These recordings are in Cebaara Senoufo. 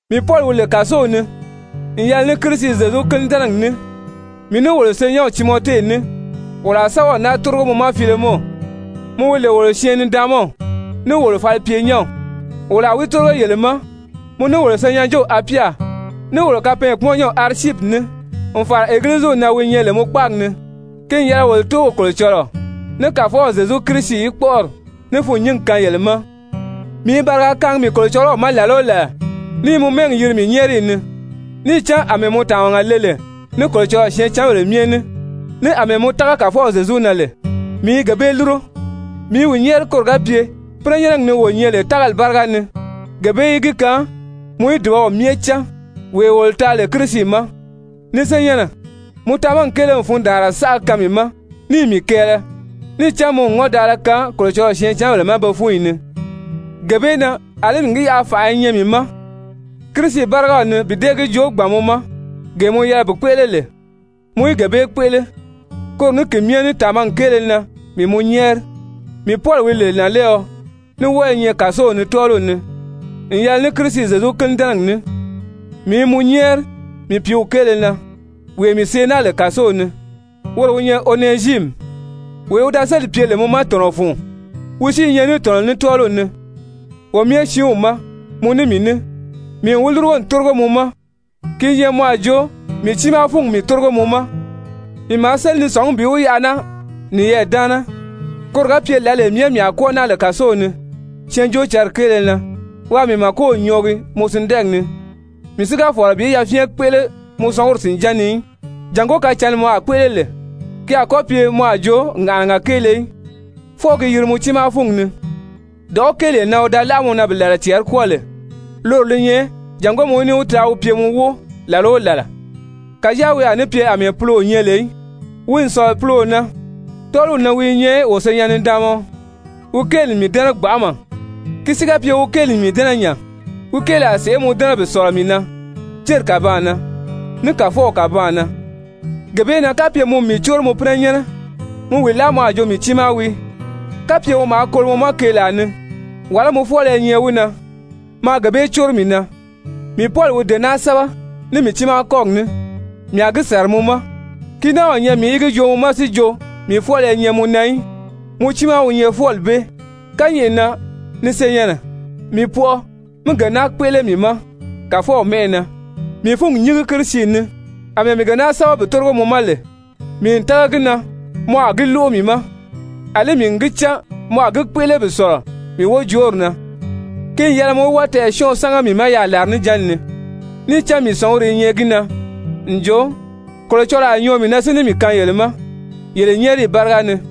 Mii Pɔli, wi lè kàsow ni n yɛlɛ ní Kirisi Zyezu kínidɛnɛgi ní, mii ní wolo senyɛnw Timɔte ní, wolo a sɛ́bɛw naa tórigo mɔ ma, Filemɔn, mɔ wi lè wolo syɛɛn-nidaanmaw ní wolo falipyenyɛnw, wolo a wi tórigo yele ma, mɔ, ní wolo senyɛnjew Apya, ní wolo kapɛɛnkpumɔnnyɛnw Arisyipi ní, n fàra Egiliziw na wi nyɛ lè mɔ kpáagi ni. Ki n yɛlɛ wolo Tóow Kolocɔlɔɔ ní Kàfɔw Zyezu Kirisi í kpɔ́ʔɔri ní fûnnyingi kaan yele ma. Mii i bariga kaangi mii Kolocɔlɔw ma làla o làla, ní i mɔ mɛ́ɛgi yiri mii nyɛ́ɛriyi ni. Níì cán àmɛɛ mɔ tàmaga le lè ní Kolocɔlɔɔ syɛɛncanbèle myɛ ní, ní àmɛɛ mɔ tága Kàfɔw Zyezu na lè, mii i gee bee lúro. Mii i wi nyɛ́ɛri koro ga pye pínɛnyɛnnɛgi ni wo nyɛ lè tágali báriga ni, gee bee í gi kaan mɔ í dùbaw myɛ cán, wee wolo taa lè Kirisi ma. Ni senyɛnnɛ, mɔ tamagi kéele n fundaanra saʔa kaan mii ma níì mii kɛɛlɛ, níì cán mɔ n ŋɔ́ndaala kaan Kolocɔlɔɔ syɛɛncanbèle ma be fúnyi ni. Gee bee na, àlí n gi yaʔa fànʔa i nyɛ mii ma Kirisi bárigaw ni bi dée gi joo gbàn mɔ ma gee mɔ yɛlɛ bi kpéʔele lè, mɔ í gee bee kpéʔele, koro ní ki myɛ ní tàmagi kéele na mii mɔ nyɛ́ɛri. Mii Pɔli wi lè nànlɛɛɔ, ní wɔ́ɔ i nyɛ kàsow ni tɔ́ɔliw ni n yɛlɛ ní Kirisi Zyezu kínidɛnɛgi ní, mii i mɔ nyɛ́ɛri mii pìíw kéele na, wee mii see naa lè kàsow ni, woro wi nyɛ Onɛziimi, wee wi da sélì pye lè mɔ ma tɔ̀nɔ fun, wi si i nyɛ ní tɔ̀nɔ ní tɔ́ɔliw ni wo myɛ siinw ma, mɔ ní mii ní. Mii n wi lúrugo n tórigo mɔ ma, ki i nyɛ mɔ a jo mii tiimaa fúngi mii tórigo mɔ ma. Mii maa séli ni sɔ̀ngí bi wi yaʔa naa niyɛɛ daana, koro ga pye lǎlee myɛ mii a kwɔ́ɔ naa lè kàsow ni Syɛɛnjóocǎnri kéele na, waa mii màkow nyɔɔgi mɔ sindɛɛgi ni. Mii si ga fɔ̀lɔ bi yafyɛn kpéʔele mɔ sɔnguri sìnján ni í, jàngó kacǎnni mɔ a kpéʔele lè, ki a kɔ́ pye mɔ a jo ŋàʔanaga kéele í, fwɔɔ gi yiri mɔ tiimaa fúngi ni. Dɔ̀ʔɔ́ kéelee na wi da láʔa mɔ na bi làla cɛɛri kwɔ́ɔ lè, loro li nyɛ jàngó mɔ í ní wi taa wi pye mɔ wóo làla o làla, kàjáa wi a ní pye àmɛɛ puloo nyɛ lè í, wi n sɔ̀lɔ puloo na, tɔ́ɔliw ni wi i nyɛ wo senyɛn-nidaanmaɔ, wi kéeli n mii dɛ́nɛ gbanʔama, ki si ga pye wi kéeli n mii dɛ́nɛ nya, wi kéeli a sèʔé mɔ dɛ́nɛ bi sɔ̀lɔ mii na, céri kàbaan na ní Kàfɔw kàbaan na. Gee bee na, kapye mɔ n mii córo mɔ pínɛnyɛnnɛ, mi wi láa mɔ a jo mii tiimaa wii. Kapye wi maa kolo mɔ ma keelaa ni, wàlá mɔ fwɔ́ɔlɔ i nyɛ wi na, maa gee bee córo mii na. Mii Pɔli wi dee naa sɛ́bɛ ní mii tiimaa kɔ́gi ní, mii a gi sàra mɔ ma, ki náa o nyɛ mii í gi joo mɔ ma, si jo mii fwɔ́ɔlɔ i nyɛ mɔ na í, mɔ tiimaa wi nyɛ fwɔ́ɔli bee. Kányɛʔɛ na, ni senyɛnnɛ, mii pɔʔɔ mí gee naa kpéʔele mii ma Kàfɔw mɛ́ʔɛ na. Mii fúngi nyíngi Kirisi ni. Amɛɛ mii gee naa sɛ́bɛ bi tórigo mɔ ma lè, mii n tága gi na mɔ a gi lóʔo mii ma, àlí mii n gi cán mɔ a gi kpéʔele bi sɔ̀lɔ mii wojoori na. Ki n yɛlɛ mɔ í wɔ́ɔ tɛɛ̀syɔnʔɔ sámaga mii ma yaà làrinijanni ni, níì cán mii sɔ̀nguri i nyɛ gi na n jo Kolocɔlɔɔ a nyɔɔ mii na si ní mii kaan yele ma yele nyɛ́ɛriyi báriga ni.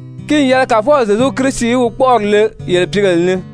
Ki n yɛlɛ Kàfɔw Zyezu Kirisi í wi kpɔ́ʔɔri le yele pìígèle ni.